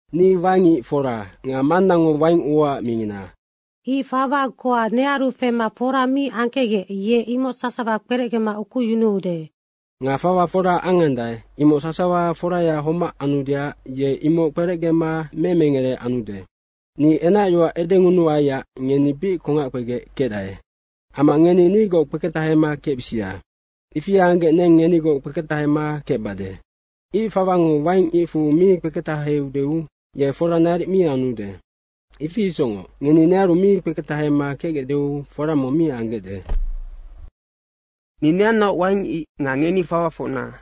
Ni waing ic fora nga Mannango wainguaac mingina. Ic fawa goa nearu fema fora mi angkecgec ye imoc sasawa kperecgema ukuyunuude. Nga fawa fora angandae, imoc sasawa foraya homac anudeac ye imoc kperecgema memengere anude. Ni enacyoac edengunuaiac ngeni bic kongac kpegec kecdae. Amma ngeni nigoc kpeketahema kecbisia. Ifi anggec neng ngenigoc kpeketahema kecbade. Ic fawango waing icfu mi kpeketaheudeu, ye fora naric mi anude. Ifi isocngoc ngeni nearu mi kpeketahema kecgecdeu fora mong mi anggecde. Ni neannaoc waing ic nga ngeni fawafocna.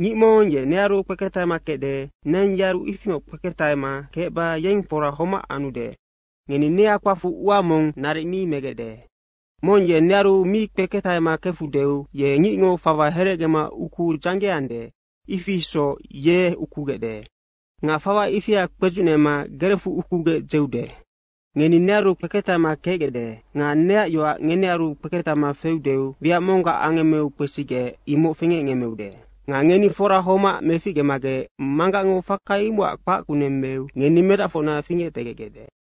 Ngic mong ye nearu kpeketahema kecde, neng yearu ifingoc kpeketahema kecba yeng fora homac anude. Ngeni nia kpacfu ua mong naric mi megecde. Mong ye nearu mi kpeketahema kefudeu ye ngicngo fawa heregema ukuu dzanggeande, ifi isoc ye ukugecde. Nga fawa ifia kpedzucnema gerecfu ukugec dzeude. Ngeni nearu kpeketahema kecgecde nga neac yoac ngenearu kpeketahema feudeu wiac monggac angemmeu kpesigec, imoc fingecngemmeude. Nga ngeni fora homac meficgemagec Manggacngo faka imocac kpac kuneng meu ngeni medacfocna fingectegecgecde.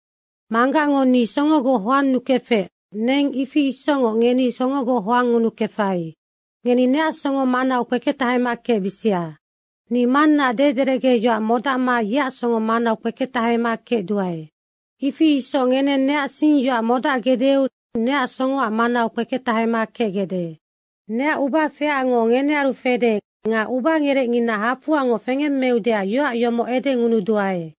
Manggacngo ni songogoc hoannukefec, neng ifi isocngoc ngeni songogoc hoangngunukefai. Ngeni neac songo manau kpeketahema kecbisia. Ni Mannaac dederecge yoac modacma yeac songo manau kpeketahema kecduae. Ifi isoc ngeneng neac singyoac modacgecdeu neac songoac manau kpeketahema kecgecde. Neac ubafeacngo ngenearu fede nga ubangerecngina hafoangoc fengemmeudeac yoac yomoc edengunuduae.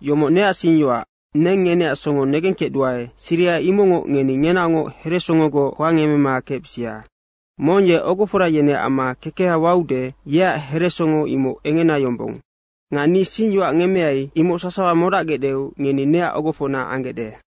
Yomoc neac singyoac, neng ngeneac songo negengkecduae, siriha imocngoc ngeni ngenaocngoc heresongogoc hoangemema kecbisia. Mong ye ogofora yeneac amma kekeha waude, yeac heresongo imoc engena yombong. Nga ni singyoac ngemmeai, imoc sasawa modacgecdeu ngeni neac ogofocna anggecde.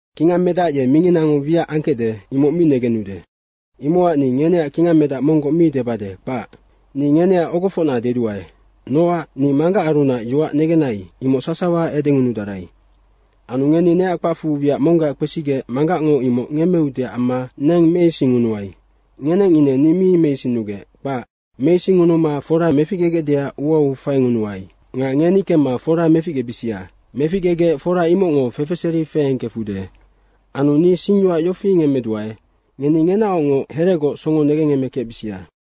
Kingangmedac ye minginango wiac angkecde, imoc mi negenude. Imocac ni ngeneac kingangmedac monggoc mi debade, kpac. Ni ngeneac ogofocna deduae, nocac ni Manggacarunac yoac negennai, imoc sasawa edengunudarai. Anu ngeni neac kpacfu wiac monggac kpesigec Manggacngo imoc ngemmeudeac amma neng meisingngunuai. Ngeneng ine ni mi meisinnugec, kpac. Meisingngunuma fora meficgegecdeac uau faingunuai. Nga ngeni kemma fora meficgebisia. Meficgegec fora imocngo fefeseri feengkefude. Anu ni singyoac yofi ngemmeduae, ngeni ngenaocngoc heregoc songo negengemekecbisia.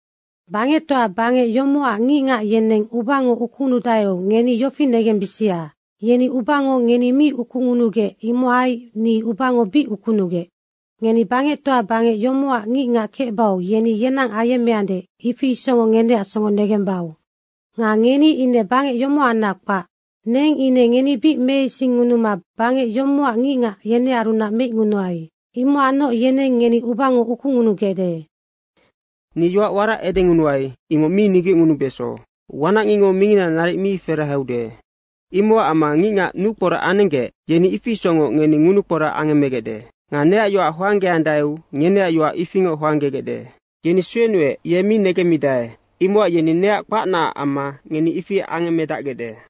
Bangectoa bangec yomocac ngicngac yeneng ubango ukungunudaeu ngeni yofi negembisia. Yeni ubango ngeni mi ukungunugec imohai ni ubango bic ukunugec. Ngeni bangectoa bangec yomocac ngicngac kecbau yeni yenang ayemmeande, ifi isocngoc ngeneac songo negembau. Nga ngeni ine bangec yomohanac kpac, neng ine ngeni bic meisingngunuma bangec yomocac ngicngac yenearunac meicngunuai. Imocacnoc yeneng ngeni ubango ukungunugecde. Ni yoac warac edengunuai, imoc mi nigecngunubeso, wanacngicngo mingina naric mi feraheude. Imocac amma ngicngac nukporac anenggec, yeni ifi isocngoc ngeni ngunukporac angemmegecde. Nga neac yoac hoanggeandaeu ngeneac yoac ifingoc hoanggegecde. Yeni suenuec, ye mi negemmidae. Imocac yeni neac kpacnaac amma ngeni ifi angemmedacgecde.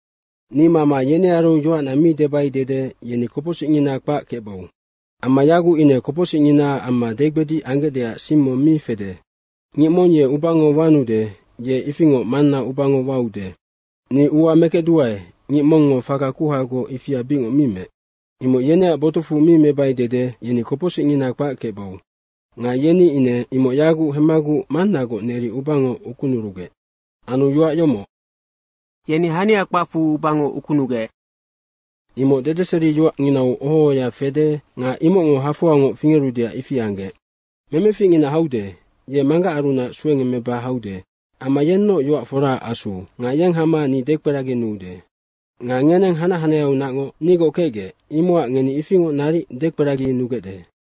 “Ni mama yenearu yoacna mi debai dede yeni kopocsicngina kpac kecbau. Amma yaguc ine kopocsicnginaac amma degbedic anggecdeac sing mong mi fede. Ngic mong ye ubango wanude, ye ifingoc Manna ubango waude. Ni ua mekecduae ngic mongngo faka kuhagoc ifia bicngoc mi meec, imoc yeneac botucfu mi mebai dede, yeni kopocsicngina kpac kecbau. Nga yeni ine imoc yaguc hemmaguc Mannagoc neri ubango ukunurugec. Anu yoac yomoc, ‘Yeni hania kpacfu ubango ukunugec.’ imoc dedeseriyoacnginau oho ohoya fede nga imocngo hafoangoc fingerudeac ifi anggec. Memeficngina haude, ye Manggacarunac suengemmeba haude amma yennoc yoac foraac Asu nga yeng hama ni dekperaginuude. Nga ngeneng hanac hanaheaunacngoc nigoc kecgec, imocac ngeni ifingoc naric dekperaginugecde.”